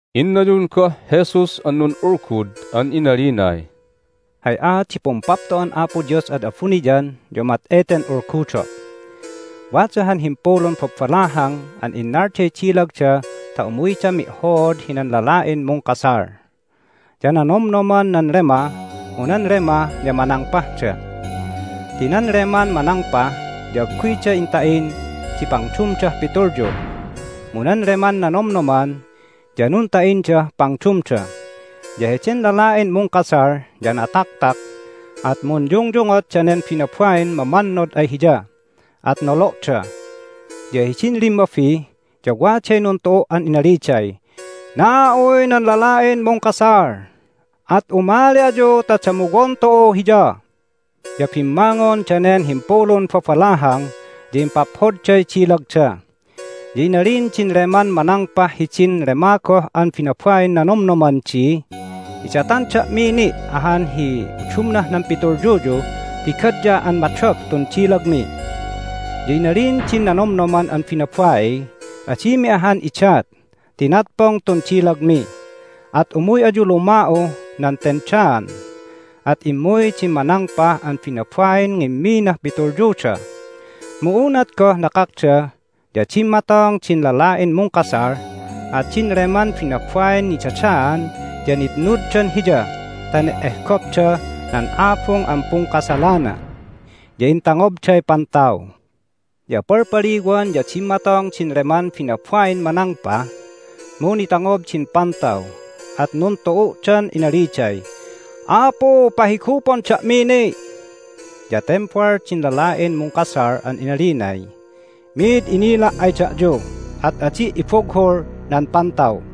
Innayun goh Jesus an nun'ulgud an inalinay, "Hay aat di Pumpapto'an Apo Dios ad abuniyan ya umat eten ulgudo': Wada han himpulun babalahang an innalday dilagda ta umuydan mi'hood hinan lala'in mungkasal. Ya nanomnoman nan lema, mu nan lema ya manangpahda ti nan leman manangpah ya agguyda inta'in di pangdumdah pitulyu, mu nan leman nanomnoman ya nunta'indah pangdumda. Ya heden lala'in mungkasal ya nataktak, at munyungyungot danen binabain mamannod ay hiya, at nolo'da. Ya hidin limmabi ya waday nuntu'u' an inaliday, Na'uy nan lala'in mungkasal! At umali ayu ta damuwon tu'u hiya! Ya bimmangon danen himpulun babalahang, ya impaphodday dilagda. Ya inalin din leman manangpah hidin lema goh an binabain nanomnoman di, Idatan da'mi ni' ahan hi udumnah nan pitulyuyu ti gadya an madop tun dilagmi! Ya inalin din nanomnoman an binabaiy, Adimi ahan idat ti natpong tun dilagmi! At umuy ayu luma'uh nan tendaan! At immuy din manangpah an binabain ngimminah pitulyuda. Mu unat goh nakakda ya dimmatong din lala'in mungkasal at din leman binabain nidadaan ya nitnuddan hiya ta ne'ehgopdah nan abung an pungkasalana. Ya intangobday pantaw. Ya palpaliwan ya dimmatong din leman binabain manangpah, mu nitangob din pantaw, at nuntu'u'dan inaliday, Apu, pahigupon da'mi ni'! Ya tembal din lala'in mungkasal an inalinay, Mid inila' ay da'yu, at adi' ibughul nan pantaw!"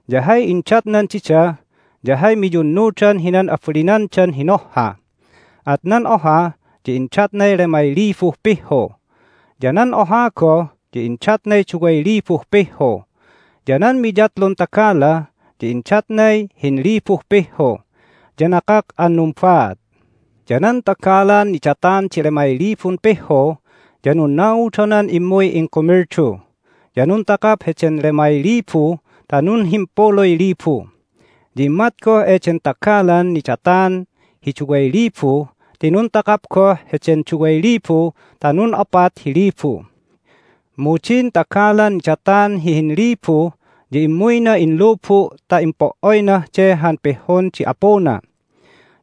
Ya hay indatnan dida ya hay miyunnudan hinan abalinandan hinohha. At nan oha ya indatnay lemay libuh pihhu, ya nan oha goh ya indatnay duway libuh pihhu, ya nan miyatlun tagala ya indatnay hinlibuh pihhu. Ya nakak an numbaat. Ya nan tagalan nidatan di lemay libun pihhu ya nunnaudonan immuy ingkumildu, ya nuntakap heden lemay libu ta nunhimpuluy libu. Ya immat goh eden tagalan nidatan hi duway libu ti nuntakap goh heden duway libu ta nun'opat hi libu. Mu din tagalan nidatan hi hinlibu ya immuyna inlubu' ta impo"oynah de han pihhun di apuna.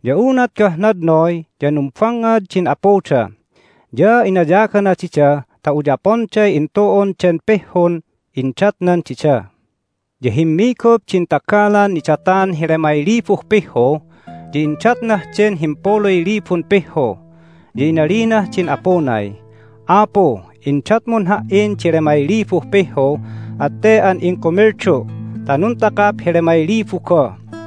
Ya unat goh nadnoy ya numbangngad din apuda, ya inayagana dida ta uyaponday intu'un den pihhun indatnan dida. Ya himmigup din tagalan nidatan hi lemay libuh pihhu, ya indatnah den himpuluy libun pihhu, ya inalinah din apunay, Apu, indatmun ha"in di lemay libuh pihhu, at te an ingkumildu' ta nuntakap hi lemay libu goh.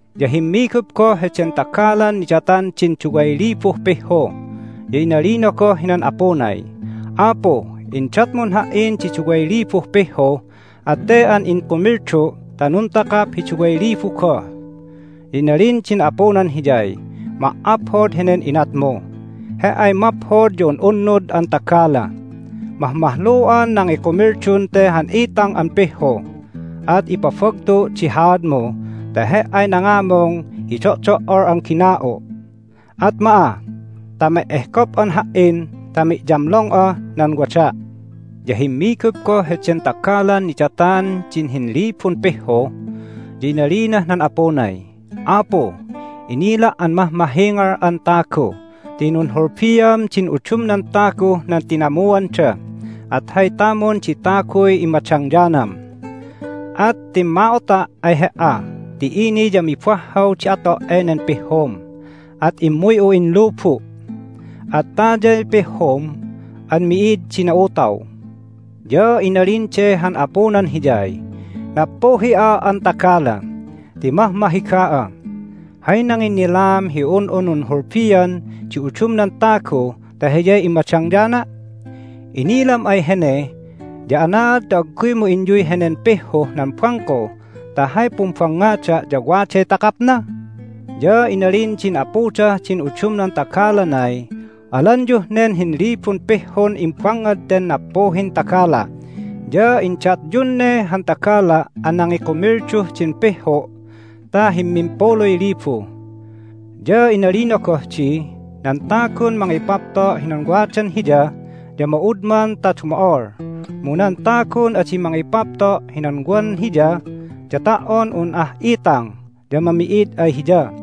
Ya himmigup goh heden tagalan nidatan din duway libuh pihhu, ya inalina goh hinan apunay, Apu, indatmun ha"in di duway libuh pihhu, at te an ingkumildu' ta nuntakap hi duway libu goh. Ya inalin din apunan hiyay, Ma"aphod henen inatmu! He"ay maphod ya un'unnud an tagala! Mahmahlu'an nangikumildun te han itang an pihhu, at ipabagtu' di haadmu ta he"ay nangamung hi do'do"ol an gina'u'. At ma'a ta me'ehgop'an Ha"in ta mi'yamlong'ah nan wada'! Ya himmigup goh heden tagalan nidatan din hinlibun pihhu, ya inalinah nan apunay, Apu, inila' an mahmahingal'an tagu ti nunhulbiam din udumnan taguh nan tinamuanda, at hay tamun di taguy immadangyanam. At timma'ota' ay he"a ti ini ya mibahhaw di ato' enen pihhum, at immuy'u inlubu'. At tayay pihhum an mi'id di na'utaw. Ya inalin de han apunan hiyay, Nappuhi'a an tagala ti mahmahiga'a! Hay nanginnilaam hi un'u nunhulbian di udumnan tagu ta hiyay immadangyana'? Inilam ay hene ya anaad ta agguymu inyuy henen pihhuh nan bangko ta hay pumbangngada' ya waday takapna? Ya inalin din apudah din udumnan tagalanay, Alanyuh nen hinlibun pihhun imbangngad ten nappuhin tagala', ya indatyun ne han tagala' an nangikumilduh din pihhu' ta himmimpuluy libu. Ya inalina goh di, Nan tagun mangipapto' hinan wadan hiya ya ma'udman ta dumo'ol, mu nan tagun adi mangipapto' hinan wan hiya ya ta"on un ah itang ya mami'id ay hiya.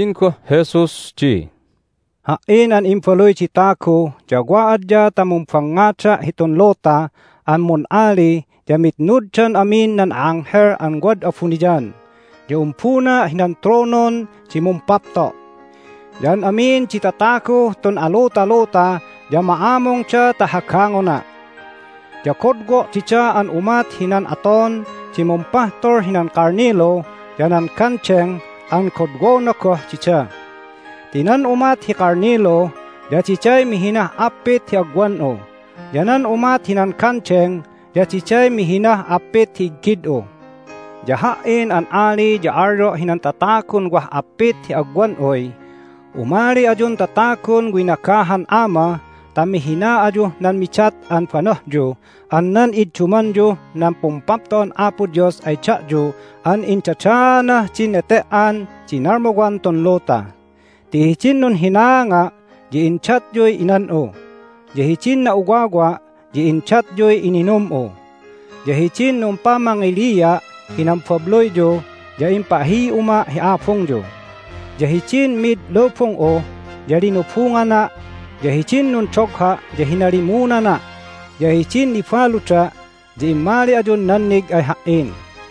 Inalin goh Jesus di, "Ha"in an Imbaluy di Tagu ya wa adya ta mumbangngada' hitun luta an mun'ali ya mitnuddan amin nan a'anghel an wad abuniyan, ya umbuna' hinan tronon di mumpapto'. Ya an amin di tataguh tun alutaluta ya ma'amungda ta hagangona'. Ya godwo' dida an umat hinan aton di mumpahtul hinan kalnilu ya nan gandeng an godwona goh dida ti nan umat hi kalnilu ya diday mihinah appit hi agwan'u, ya nan umat hinan gandeng ya diday mihinah appit hi iggid'u. Ya Ha"in an ali ya alyo' hinan tatagun wah appit hi agwan'uy, Umali ayun tatagun winagahan Ama ta mihina ayuh nan midat an banohyu an nan iddumanyuh nan Pumpapto'an Apo Dios ay da'yu an indadaanah din nete"an di nalmuwan tun luta. Ti hidin nunhinaanga' ya indatyuy inan'u, ya hidin na'uwawa' ya indatyuy ininum'u, ya hidin numpamangilia' hinan babluyyu ya impahi'uma' hi abungyu, ya hidin mid lubung'u ya linubungana', ya hidin nundogha' ya hinalimunana', ya hidin nibaluda' ya immali ayun nannig ay Ha"in.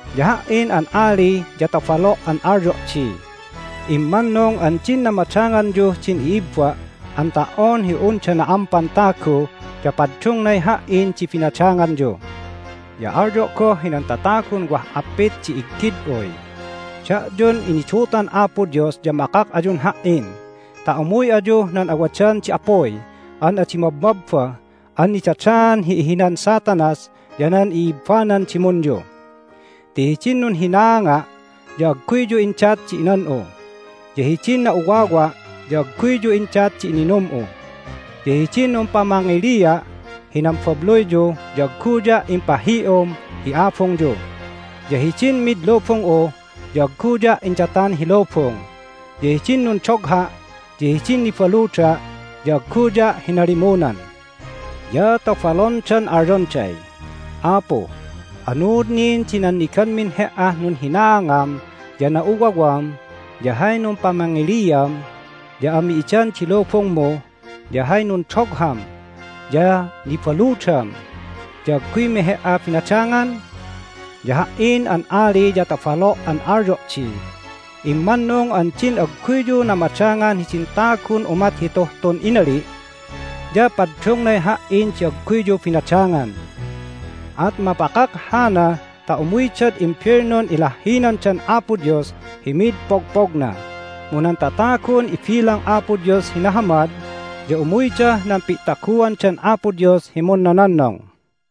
Ya Ha"in an ali ya tobalo' an alyo' di, Immannung an din namadanganyuh din i'ibba' an ta"on hi unda na'ampan tagu ya paddungnay Ha"in di binadanganyu! Ya alyo' goh hinan tatagun wah appit di iggid'uy, Da'yun inidutan Apo Dios ya makak ayun Ha"in ta umuy ayuh nan awadan di apuy an adi mabmabba an nidadaan hi ihinan Satanas ya nan i'ibbanan dimunyu. Ti hidin nunhinaanga' ya agguyyu indat di inan'u, ya hidin na'uwawa' ya agguyyu indat di ininum'u, ya hidin numpamangilia' hinan babluyyu ya agguya' impahi'um hi abungyu, ya hidin mid lubung'u ya agguya' indatan hi lubung, ya hidin nundogha' ya din nibaluda' ya agguya' hinalimunan. Ya tobalondan alyonday, Apu, anuud nin di nanniganmin He"ah nunhinaangam ya na'uwawam, ya hay numpamangiliam ya ami'idan di lubungmu, ya hay nundogham ya nibaludam ya agguymi He"a binadangan? Ya Ha"in an ali ya tobalo' an alyo' di, Immannung an din agguyyu namadangan hidin tagun umat hituh tun inali' ya paddungnay Ha"in di agguyyu binadangan. At mapakak hana ta umuydad imbelnun ilahhinandan Apo Dios hi mid pogpogna, mu nan tatagun ibilang Apo Dios hi nahamad ya umuydah nan pi'taguandan Apo Dios hi munnononnong."